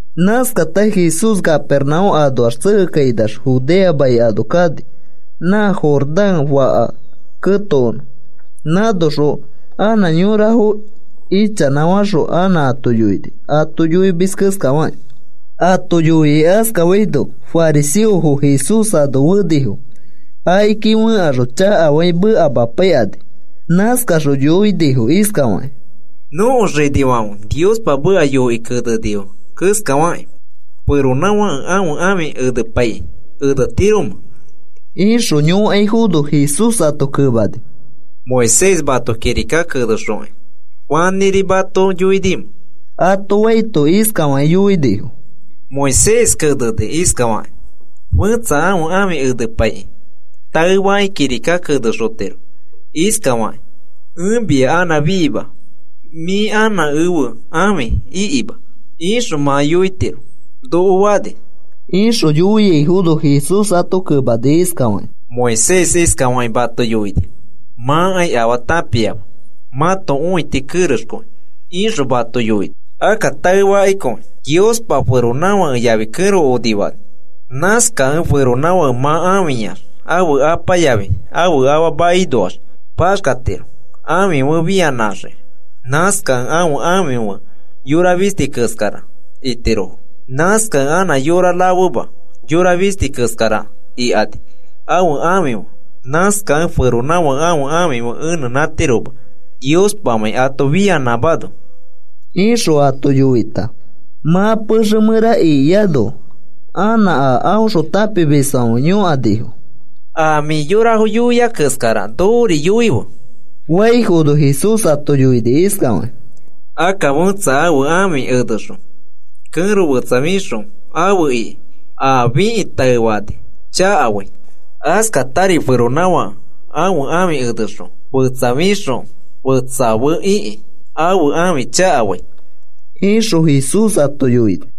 Nãskata Jesús Capernaúm anoax tsekekainax Judea mai ano kani. Nã Jordán faka ketokonõ, nãnoxõ anã yorafo ichanãfaxõ anã ato yoini, ato yoimis keskafakĩ. Ato yoikĩ askafaino fariseofo Jesús ano fenifo. Akiki fẽkaxõ chakafakĩ mekamapaikani. Nãskaxõ yõkanifo iskafakĩ: “Nõko xinifãfe Niospa meka yoikĩ kenenifo keskafakĩ, ¿feronãfãke ãfe ãfi enepaikĩ enetiromẽ?” ixõ yõkaifono, Jesús ato kemani: “Moisés mato kirika kenexokĩ, ¿fanĩri mato yoinimẽ?” ato faito, iskafakĩ yoinifo: “Moisés kenekĩ iskafani: ‘Fẽtsa ãfe ãfi enepaikĩ taefakĩ kirika kenexotiro iskafakĩ: “Ẽ mia anã fiima, mĩ anã ẽfe ãfi ikima,” ’ ixõ mã yoitiro noko fani,” ixõ yoiaifono, Jesús ato kemani iskafakĩ: “Moisés iskafakĩ mato yoini: ‘Mãkai afaa tãpiama mãto õiti kerexkõi,’ ixõ mato yoini. Akka taekõifakĩ, Niospa feronãfake yafi kẽro onifani. Nãskakẽ feronãfake mã ãfiyax ãfe apa yafi ãfe afa makinoax paxkatiro ãfi fe fianãxiki. Nãskakẽ ãfe ãfi fe yora fisti keskara itirofo. Nãskakẽ anã yora rafema, yora fisti keskara ikani ãfe ãfi fe. Nãskakẽ feronãfãke ãfe ãfi enetiroma Niospamãi ato fianãmano,” ixõ ato yoita, mã pexe mẽra ikiano, anã a aõxõ tãpimisfãfe yõkanifo: “A mĩ yorafo rama yoiai keskara nokori yoife,” faifono, Jesús ato yoini iskafakĩ: “Akka fẽtsa ãfe ãfi enexõ kẽro fetsa fixõ afe ikĩ a fikĩ taefani chakafai. Askatari feronãfake ãfe ãfi enexõ fetsa fixõ fetsa fe ikĩ ãfe ãfi chakafai,” ixõ Jesús ato yoini.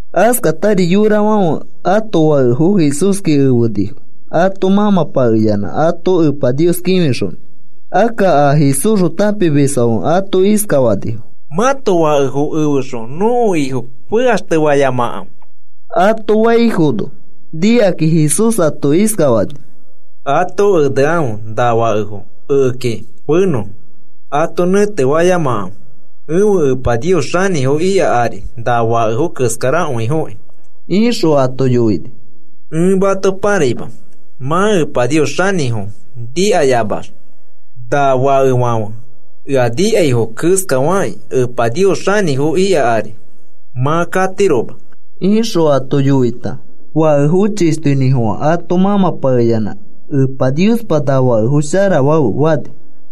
Askatari yorafãfe ãto fakefo Jesúski efenifo ato mãmãpakeyanã ato Epa Nios kĩfixonõ. Akka a Jesúsxõ tãpimisfãfe ato iskafanifo: “Mãto fakefo efexõ nõko Ifo fekaxtefayamakãfe,” ato faifono, nikakĩ Jesús ato iskafani: “Ato enekãfe na fakefo ekeki fenõfo, ato nẽtefayamakãfe. Ẽfe Epa Nios xanĩfo ika ari na fakefo keskarakõifoki,” ixõ ato yoini. “Ẽ mato pãraima, mã Epa Nios xanĩfo nikayamax na fakefãfe ea nikaifo keskafakĩ, Epa Nios xanĩfo ika ari mã katiroma,” ixõ ato yoita, fakefo chishtoinĩfofã ato mãmãpakeyanã: “Epa Niospa, na fakefo sharafafe,” fani.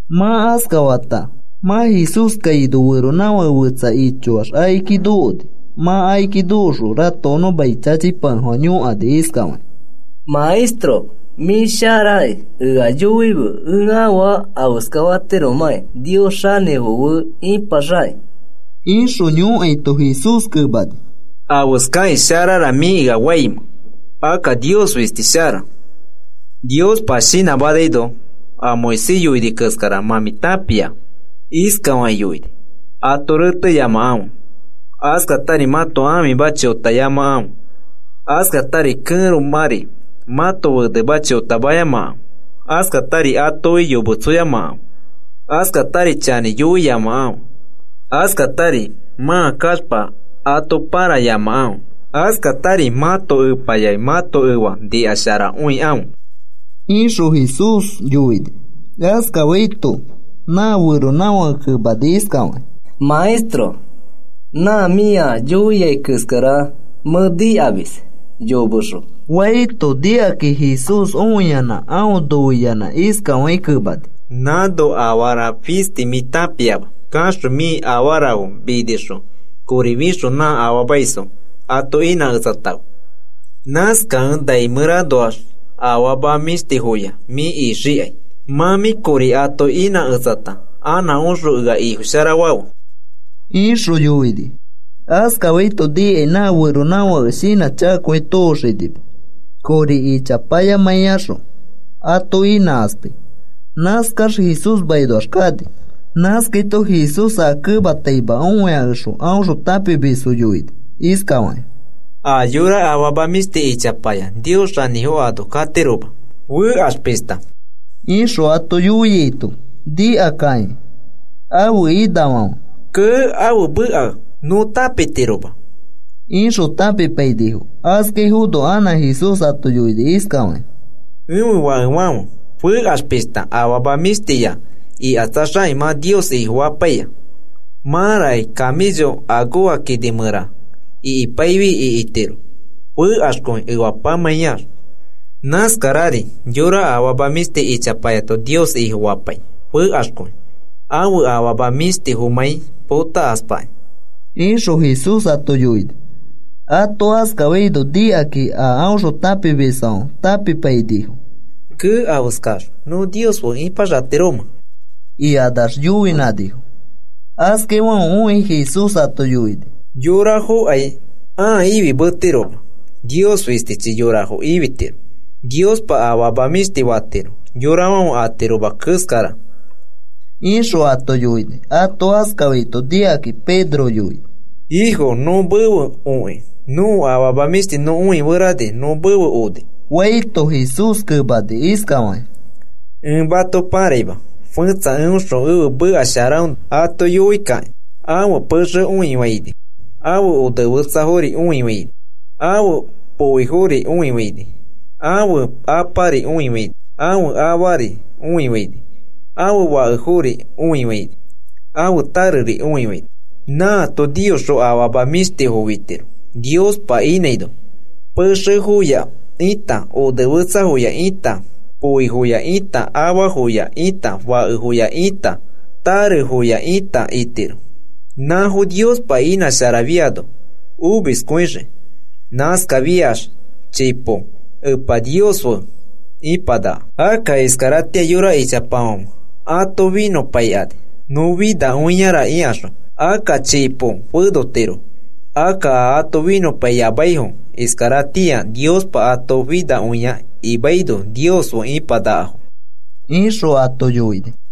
Mã askafata mã Jesús kaino feronãfake fetsa ichoax akiki nokoni. Mã akiki nokoxõ ratokonõ mai chachipakefofã yõkani iskafakĩ: “Maestro mĩ sharaki, ea yoife ẽ afaa afeskatiromakĩ Nios xanĩfo fe ipaxakĩ,” ixõ yõkaito, Jesús kemani: “¿Afeskakĩ sharara mĩ ea faimẽ? Akka Nios fisti shara. Niospa shinãmanaino a Moisés yoini keskara mã mĩ tãpia. Iskafakĩ yoini: ‘Ato reteyamakãfe, askatari mãto ãfima chotayamakãfe, askatari kẽromãri mãto fenema chotamayamakãfe, askatari atoki yometsoyamakãfe, askatari chanĩ yoiyamakãfe, askatari mã kaxpa ato pãrayamakãfe, askatari mãto epa yafi mãto efa nikasharakõikãfe,’” ixõ Jesús yoini. Askafaito nã feronãfake kemani iskafakĩ: “Maestro, nã mĩa yoiai keskara mẽ nikamis yomexõ,” faito, nikakĩ Jesús õiyanã aõ noiyanã iskafakĩ kemani: “Nãno afara fisti mĩ tãpiama. Kaxõ mĩ afarafo minixõ kori fixõ nã afaamaisfo ato inãketsatãfe. Nãskakẽ nai mẽranoax afama mĩshtifoya mĩ ixikai. Mã mĩ kori ato inãketsata anã oxõ ea Ifofasharafe,” ixõ yoini. Askafaito nikai nã feronãfake shinãchakakõi tooxinima kori ichapayamãiyaxõ ato inãkaspai. Nãskax Jesús makinoax kani. Nãskaito Jesús aa kemataima õiakexõ, aõxõ tãpimisfo yoini iskafakĩ: “A yora afama mĩshti ichapaya Nios xanĩfo ano katiroma, fekax pishta,” ixõ ato yoiaito, nikakakĩ ãfe inafãfe: “Kee, ãfe meka nõ tãpitiroma,” ixõ tãpipainifo. Askaifono anã Jesús ato yoini iskafakĩ: “Ẽfe fakefãfe, fekax pishta afama mĩshtifoya ikatsaxakĩ mã Nios Ifofapaia. Mãraki camello akoja kini mẽra ikipaifi ikitiro, fekaxkõi efapamãiax. Nãskarari yora afama mĩshti ichapayato Nios Ifofapai, fekaxkõi ãfe afama mĩshtifomãi potakaspakĩ,” ixõ Jesús ato yoini. Ato askafaito nikakakĩ a aõxõ tãpimisfãfe tãpipainifo. “¡Kee! ¿Afeskax nõ Nios fe ipaxatiromẽ?” ikanax yoinãnifo. Askaifãfe õikĩ Jesús ato yoini: “Yorafokai ãa ifimetirofoma. Nios fistichi yorafo ifitiro. Niospa afama mĩshtifo fatiro, yorafãfe atiroma keskara,” ixõ ato yoini. Ato askafaito nikakĩ Pedro yoini: “Ifo, nõ mefe okĩ nõko afama mĩshtifo nõ õiferani nõ mefe oni,” faito, Jesús kemani iskafakĩ: “Ẽ mato paraima, fẽtsa eõxõ ẽfe meka sharaõnoa ato yoikakĩ ãfe pexe õifaini, ãfe onefetsafori õifaini, ãfe poifori õifaini, ãfe apari õifaini, ãfe afari õifaini, ãfe fakefori õifaini, ãfe tareri õifaini, nãato niyoxõ afama mĩshtifo fitiro, Niospa inãino, pexefoya ita, onefetsafoya ita, poifoya ita, afafoya ita, fakefoya ita, tarefoya ita itiro. Nãfo Niospa inãsharafiano omiskõixii. Nãskafiax chipo Epa Nios fe ipanaka. Akka iskaratĩa yora ichapafãfe ato finõpaikani, nõ finakõiara ikaxõ, akka chipo fenotirofo. Akka a ato finõpaiyamaifo iskaratĩa Niospa ato finakõia imaino Nios fe ipanakafo,” ixõ ato yoini.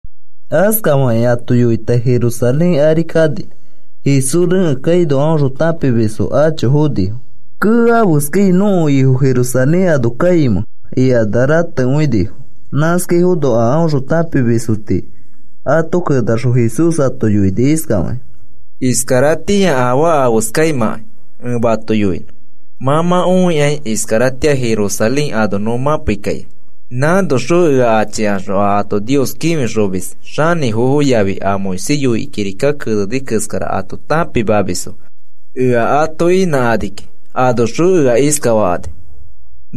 Askafakĩ ato yoita Jerusalén ari kani. Jesús rekẽ kaino aõxõ tãpimisfo acho fonifo. “Kee, ¿afeskai nõko Ifo Jerusalén ano kaimẽ?” ikanax ratekõinifo. Nãskaifono a aõxõ tãpimisfo tii ato kenaxõ Jesús ato yoini iskafakĩ: “Iskaratĩa afaa afeskaimãkai ẽ mato yoinõ. Mã mã õikai, iskaratĩa Jerusalén ano nõ mãpei kaikai. Nãnoxõ ea achikaxõ a ato Nios kĩfixomis xanĩfofo yafi a Moisés yoikĩ kirika keneni keskara ato tãpimamisfo ea ato inãkani kiki. Anoxõ ea iskafakani: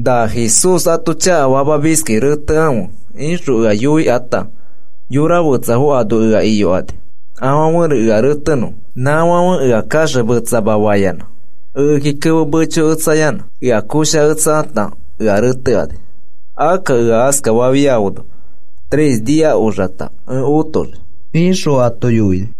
‘Na Jesús ato chakafamiskĩ retekãfe,’ ixõ ea yoikãta, yora fetsafo ano ea iyokani afãfe ea retenõfo. Nãfãfe ea kaxemetsama fayanã, ekeki kemo mechoketsayanã ea koshaketsakata ea retekani. Akka ea askafafiafono tres nia oxata ẽ otoxii,” ixõ ato yoini.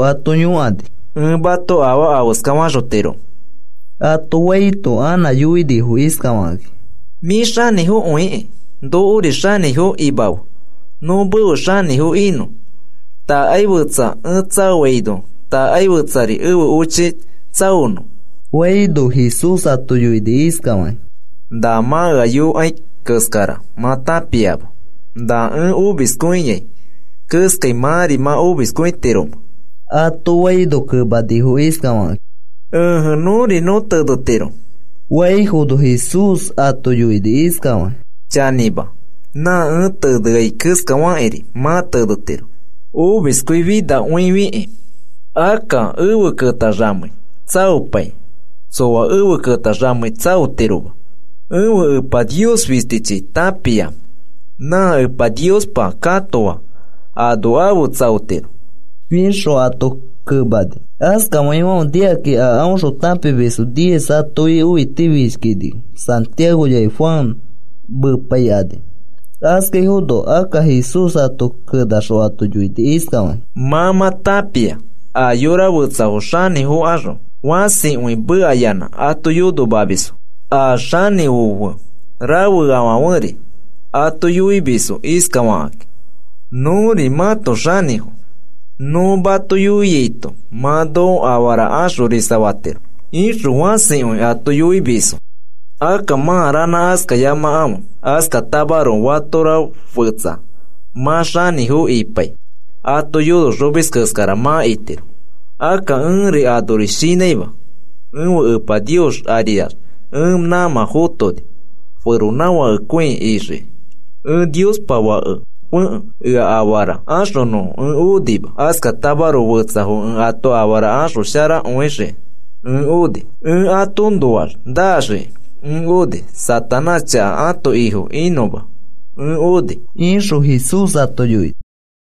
ato yõkani: “¿Ẽ mato afaa afeska faxotiromẽ?” ato faito, anã yoinifo iskafakakĩ: “Mĩ xanĩfokõikĩ nokori xanĩfo imafe, nõ mefe xanĩfo inõ. Takai fetsa ẽ tsaofaino, takai fetsari ẽfe ochi tsaonõ,” faifono, Jesús ato yoini iskafakĩ: “Na mã ea yõkai keskara mã tãpiama. ¿Na ẽ omiskõiai keskai mãri mã omiskõitiromẽ?” ato faino, kemanifo iskafakakĩ: “Ẽje, nõri nõ tenetiro,” faifono, Jesús ato yoini iskafakĩ: “Chanĩma, nã ẽ teneai keskafakĩri, mã tenetiro omiskõifinakõifikĩ. Akka efe ketaxamei tsaopai tsoa efe ketaxamei tsaotiroma. Ẽfe Epa Nios fistichi tãpia. Nã Epa Niospa katoafo ano efe tsaotirofo,” ixõ ato kemani. Askafaifãfe nikakani a aõxõ tãpimisfo diez atoki õitifishkinifo, Santiago yafi Juan mepaikani. Askaifono akka Jesús ato kenaxõ ato yoini iskafakĩ: “Mã mã tãpia, yora fetsafo xanĩfokaxõ fãsikõi mekayanã ato yonomamisfo. A xanĩfo fe rafeafãferi ato yoimisfo iskafakakĩ: ‘Nõri mãto xanĩfo. Nõ mato yoiaito mã noko afara axorisafatiro,’ ixõ fãsikõi ato yoimisfo. Akka mã ranã askayamakãfe. Askatamaroko fatora fetsa mã xanĩfo ipai, ato yonoxomis keskara mã itiro. Akka ẽri anori shinãima, ẽfe Epa Nios ariax ẽ nãmã fotoni feronãfakekõi ixiki, ẽ Niospa Fakefekẽ ea afara axonõfo ẽ onima. Askatamaroko fetsafo ẽ ato afara sharafaxoxiki ẽ oni. Ẽ atoõnoax naxiki ẽ oni. Satanás chaka ãto ifo inõma ẽ oni,” ixõ Jesús ato yoini.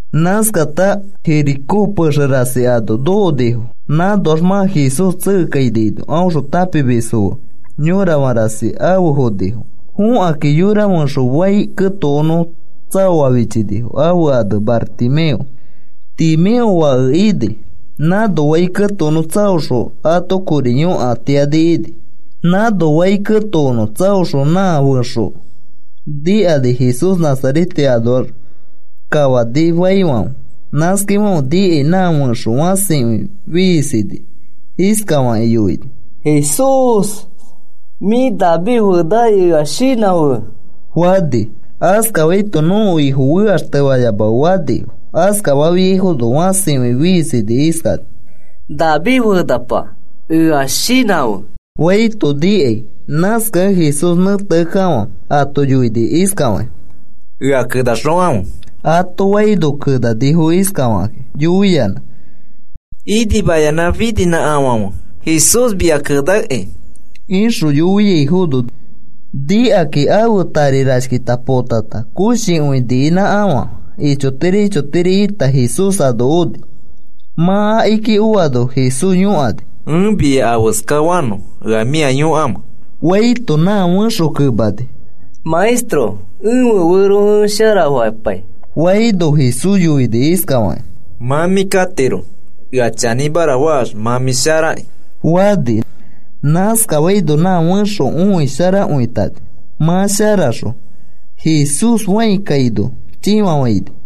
Nãskata Jericó pexe rasi ano nokonifo. Nãnoax mã Jesús tsekekainaino, aõxõ tãpimisfo fe yõrafã rasi afe fonifo. Fokãkĩ yora fẽxo fai ketokonõ tsaoa fichinifo, ãfe ane Bartimeo, Timeo fake ini. Nãno fai ketokonõ tsaoxõ ato kori yõkatiani ini. Nãno fai ketokonõ tsaoxõ nã fẽxo nikani Jesús Nazarete anoa kafani faifãfe. Nãskafaifãfe nikai nã fẽxo fãsikõi fiisini, iskafakĩ yoini: “¡Jesús mĩfi David fenaki, ea shinãfe!” fani. Askafaito, “Nõko Ifo fekaxtefayamafe,” fanifo. Askafafiaifono fãsikõi fiisini, iskani: “¡David fenapa, ea shinãfe!” faito nikai. Nãskakẽ Jesús nẽteakekafã ato yoini iskafakĩ: “Ea kenaxokãfe,” ato faino, kenanifo iskafakĩ yoiyanã: “Inimayanã fininãkafãfe, Jesús mia kenakĩ,” ixõ yoiaifono, nikakĩ ãfe tari rashkita potata koshikõi niinãkafã ichotiri ichotiri ita Jesús ano oni. Mã akiki oano Jesús yõkani: “¿Ẽ mia afeska fanõ ea mĩa yõkamẽ?” faito, nã fẽxo kemani: “Maestro, ẽfe fero ẽ sharafapai,” faino, Jesús yoini iskafakĩ: “Mã mĩ katiro, ea chanĩmara faax, mã mĩ sharaki,” fani. Naskafaino nã fẽxo õisharakõitani. Mã sharaxõ Jesús fãi kaino chĩfafaini.